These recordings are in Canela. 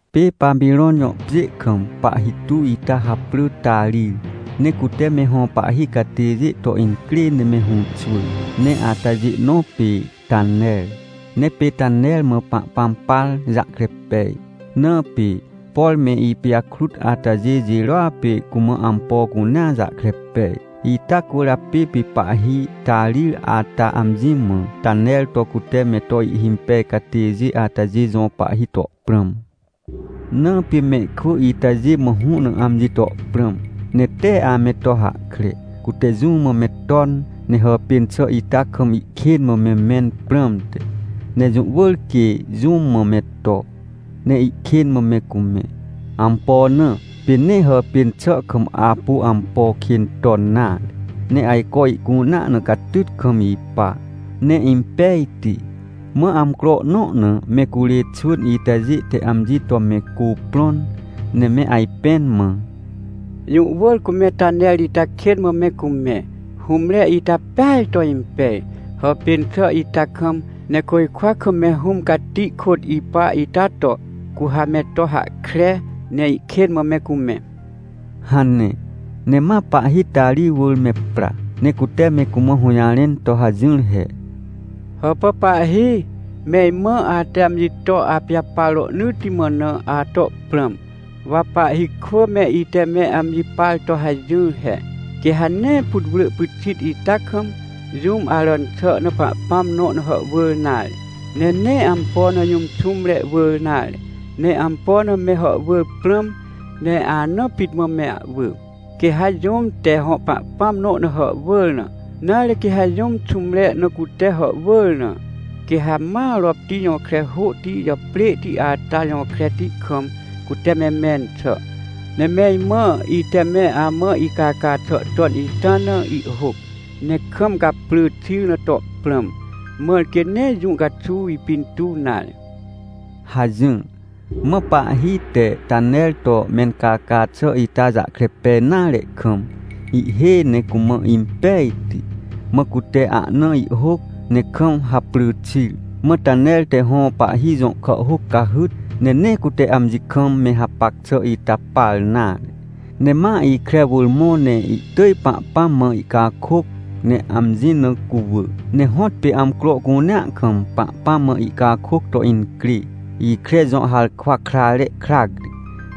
Pê Papirõn jõ pjê kam pahhi tuw ita japrỳ Tarir. Ne cute me hõ pahhi catêjê to incrê ne me hũxwỳr, ne atajê nõ pê Taner. Ne pê Taner mã Pahpãm par jahkre pej, na pê, por me ipijakrut atajê jirôa pê cumã ampo cunea jahkre pej. Ita cwỳrjapê pê pahhi Tarir ata amji mã Taner to cute me to ihhimpej catêjê atajê jõ pahhi to prãm. Na pê mehkwỳ itajê mã hũ na amji to prãm, ne tee ame to hahkre, cute jũ mã me ton, ne hàpên xà ita kam ihkên mã me mẽn prãmte. Ne jũ wỳr quê jũ mã me to, ne ihkên mã me cumẽ. Ampo na? Pê nee hàpên xà kam apu ampo kên ton nare, ne ajco ihcunea na catyt kam ipa, ne impejti. Mã amcro nõ na me curê xwỳn itajê te amji to me cuprõn, ne me ajpẽn mã: — Jũ wỳr cu me Taner ita kên mã me cumẽ, hũmre ita peaj to impej, hàpên xà ita kam. Ne côjkwa kam me Hũm Cati kôt ipa ita to, cu ha me to hahkre ne ihkên mã me cumẽ — hane. Ne ma pahhi Tarir wỳr me pra, ne cute me cumã hũjarẽn to hajỹr he: — Hàpà pahhi! Me imã, ate amji to apijapar rohnỳtti mã na, ato prãm. Wa pahhi kwỳ me ite me amji par to hajỹr he, quê ha nee putwrỳ pyxit ita kam, jũm aràn xà na pahpãm nõ na hàhwỳr nare, ne nee ampo na jũm xũmre wỳr nare. Ne ampo na me hàhwỳr prãm, ne anaa pit mã me ahwỳ. — Quê ha jũm te hõ pahpãm nõ na hàhwỳr na, nare, quê ha jũm xũmre na cute hàhwỳr na, quê ha ma ropti jõkre hôhti jàprêhti ata jõ kreti kam, cute me mẽn xà. Ne me imã, ite me amã icaca xà ton ita na ihhôc, ne kam gaprỳ xir na to prãm, mãr quê nee jũ caxuw ipintuw nare — hajỹr. Mã pahhi te Taner to mencaca xà ita jahkre pej nare kam, ihhêj ne cumã impejti, mã cute ahna ihhôc, ne kam haprỳ xir. Mã Taner te hõ pahhi jõ kàhhôc cahyt, ne nee cute amji kam me hapac xà ita par nare, ne ma ikre wỳr mõ ne ihtỳj Pahpãm mã ihcakôc, ne amji na cuwỳ. Ne hõtpê amcro cunea kam Pahpãm mã ihcakôc to incrê, ikre jõ harkwa krare krac ri,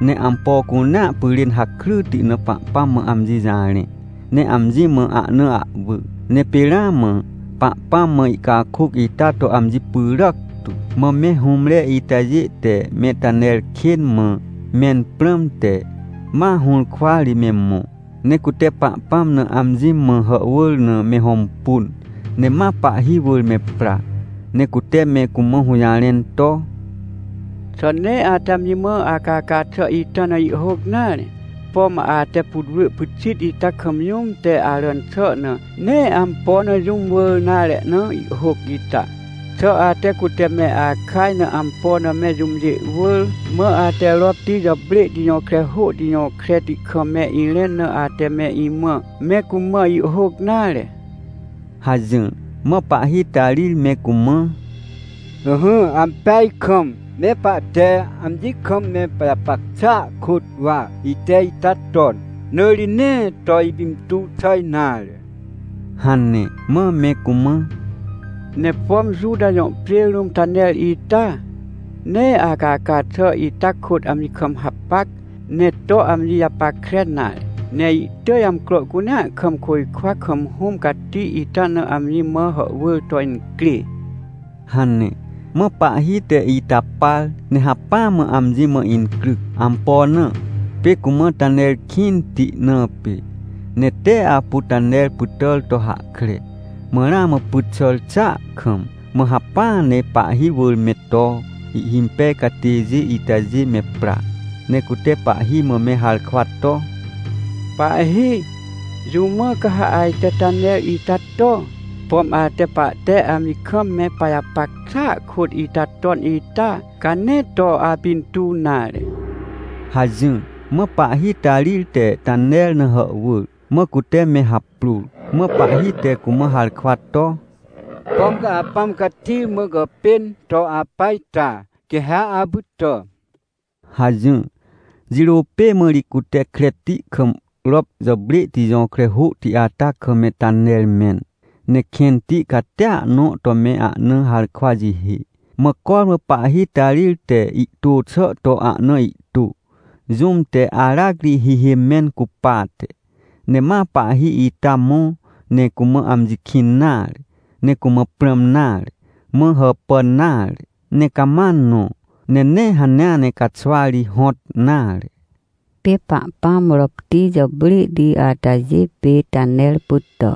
ne ampo cunea pyrên hakryti na Pahpãm mã amji jarẽ, ne amji mã ahna ahwỳ. Ne pê ramã Pahpãm mã ihcakôc ita to amji pyràc tu. Mã me hũmre itajê te me Taner kên mã mẽn prãmte, ma hũrkwa ri me mõ, ne cute Pahpãm na amji mã hàhwỳr na me hõmpun. Ne ma pahhi wỳr me pra, ne cute me cumã hũjarẽn to: — Xà nee ate amji mã acaca xà ita na ihhôc nare? Pom ate putwrỳ pyxit ita kam jũm te aràn xà na, nee ampo na jũm wỳr nare ahna ihhôc ita? Xà ate cute me akaj na ampo na me jũmjê wỳr mã ate ropti jàprêhti jõkre hôhti jõ kreti kam me irẽn na ate me imã, me cumã ihhôc nare? — hajỹr. Mã pahhi Tarir me cumã: — Ỹhỹ, ampeaj kam me pahte amji kam me pajapac xàa kôt wa ite ita ton, na ri nee to ipintuw xà nare — hane. Mã me cumã: — Ne pom Juta jõ pjê rũm Taner ita, nee acaca xà ita kôt amji kam hapac, ne to amji japackre nare, ne ihtỳj amcro cunea kam côjkwa kam Hũm Cati ita na amji mã hàhwỳr to incrê — hane. Mã pahhi te ita par, ne hacpỹa mã amji mã incryc. Ampo na? Pê cumã Taner kĩnti na pê. Ne tee apu Taner pytàr to hahkre. Mã ramã pyt xàr xàa kam, mã hacpỹa ne pahhi wỳr me to ihhimpej catêjê itajê me pra, ne cute pahhi mã me harkwa to: — Pahhi, jũ mã ca ha ajte Taner ita to? Pom ate pahte amji kam me pajapac xàa kôt ita ton ita, ca nee to apintuw nare — hajỹr. Mã pahhi Tarir te Taner na hàhwỳr. Mã cute me haprôr, mã pahhi te cumã harkwa to: — Pom ca Apãm Cati mã gàpên to apa ita, quê ha apytà — hajỹr. Jirô pê mã ri cute kreti kam rop jàprêhti jõkre hôhti ata kam me Taner mẽn. Ne kẽnti catia nõ to me ahna harkwa jihê. Mã cormã pahhi Tarir te ihtô xà to ahna ihtô, jũm te aracri hihê mẽn cupate. Ne ma pahhi ita mõ, ne cumã amji kĩn nare, ne cumã prãm nare, ne hàpàn nare, ne cama nõ. Ne nee hanea ne caxwa ri hõt nare. Pê Pahpãm ropti jàprêhti atajê pê Taner pytà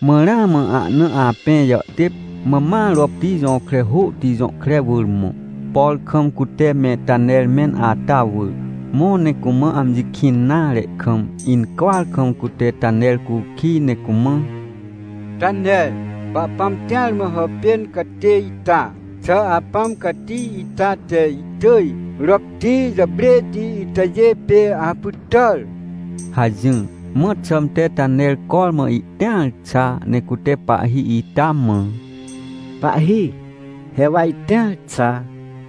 Mã ramã ahna apẽ jàhtêp, mã ma ropti jõkre hôhti jõ kre wỳr mõ, por kam cute me Taner mẽn ata wỳr. Mõ, ne cumã amji kĩn nare kam, incwỳar kam cute Taner cukij ne cumã: — Taner, Pahpãm tĩar mã hàpên catê ita, xà Apãm Cati ita te ihtỳj ropti jàprêhti itajê pê apytàr? — hajỹr. Mã xãmte Taner cormã ihtĩar xa ne cute pahhi ita mã: — Pahhi, he wa itĩar xa.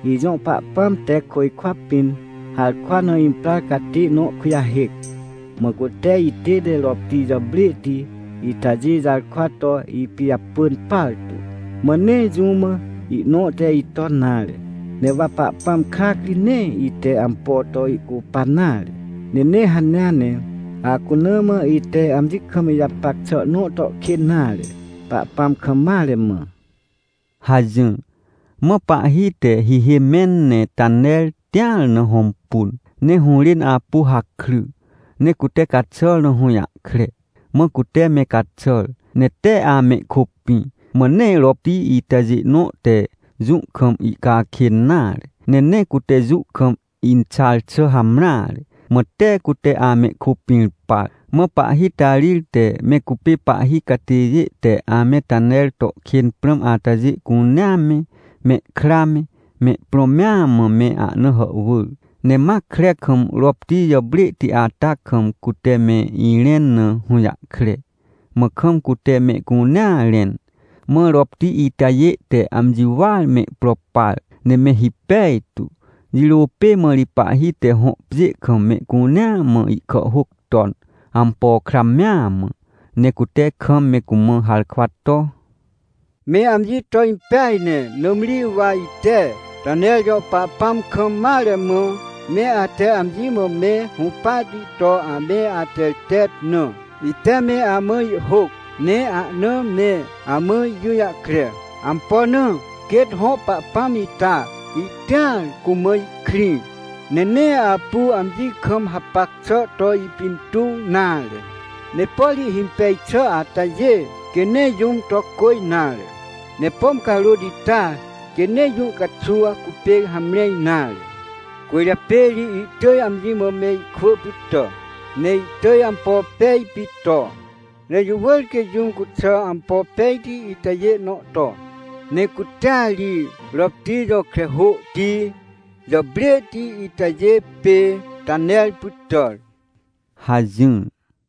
Ijõ Pahpãm te côjkwa pĩn harkwa na imprar catê nõ kujahêc, mã cute itête ropti jàprêhti itajê jarkwa to ipijapỳn partu, mã nee jũ mã ihnõ te iton nare. Ne wa Pahpãm krac ri nee ite ampo to ihcupan nare, ne nee hanea ne acuna mã ite amji kam ijapac xà nõ to kên nare, Pahpãm kam mare mã — hajỹr. Mã pahhi te hihê mẽn ne Taner tĩar na hõmpun, ne hũrên apu hakry, ne cute caxàr na hũjahkre. Mã cute me caxàr, ne tee amehkôpĩ, mã nee ropti itajê nõ te jũ kam ihcakên nare, ne nee cute jũ kam inxar xà hamreare. Mã tee cute amehkôpĩr par. Mã pahhi Tarir te me cupê pahhi catêjê te ame Taner to kên prãm atajê cunea me, mehkra me mehprõ mea mã me ahna hàhwỳr. Ne ma kre kam ropti jàprêhti ata kam, cute me irẽn na hũjahkre. Mã kam cute mehcunea rẽn. Mã ropti itajê te amji wỳar mehpro par, ne me hipej tu. Jirô pê mã ri pahhi te hõ pjê kam mehcunea mã ihkàhhôc ton, ampo kra mea mã, ne cute kam me cumã harkwa to: “Me amji to impej ne, nãmri wa ite Taner jõ Pahpãm kam mare mã, me ate amji mã me hũpahti to ame atertet na, ite me amã ihhôc, ne ahna me amã ijũjahkre. Ampo na? Quêt hõ Pahpãm ita ihtĩar cumã ihkrĩ, ne nee apu amji kam hapac xà to ipintuw nare. Ne por ihhimpej xà atajê, quê nee jũm to cô nare. Ne pom carôt ita quê nee jũ caxuw cupê hamre nare, cwỳrjapê ri ihtỳj amji mã mehkwỳ pytà. Ne ihtỳj ampo pej pit to. Ne jũ wỳr quê jũm cuxà ampo pejti itajê nõ to. Ne cutea ri ropti jõkre hôhti jàprêhti itajê pê Taner pytàr” hajỹr.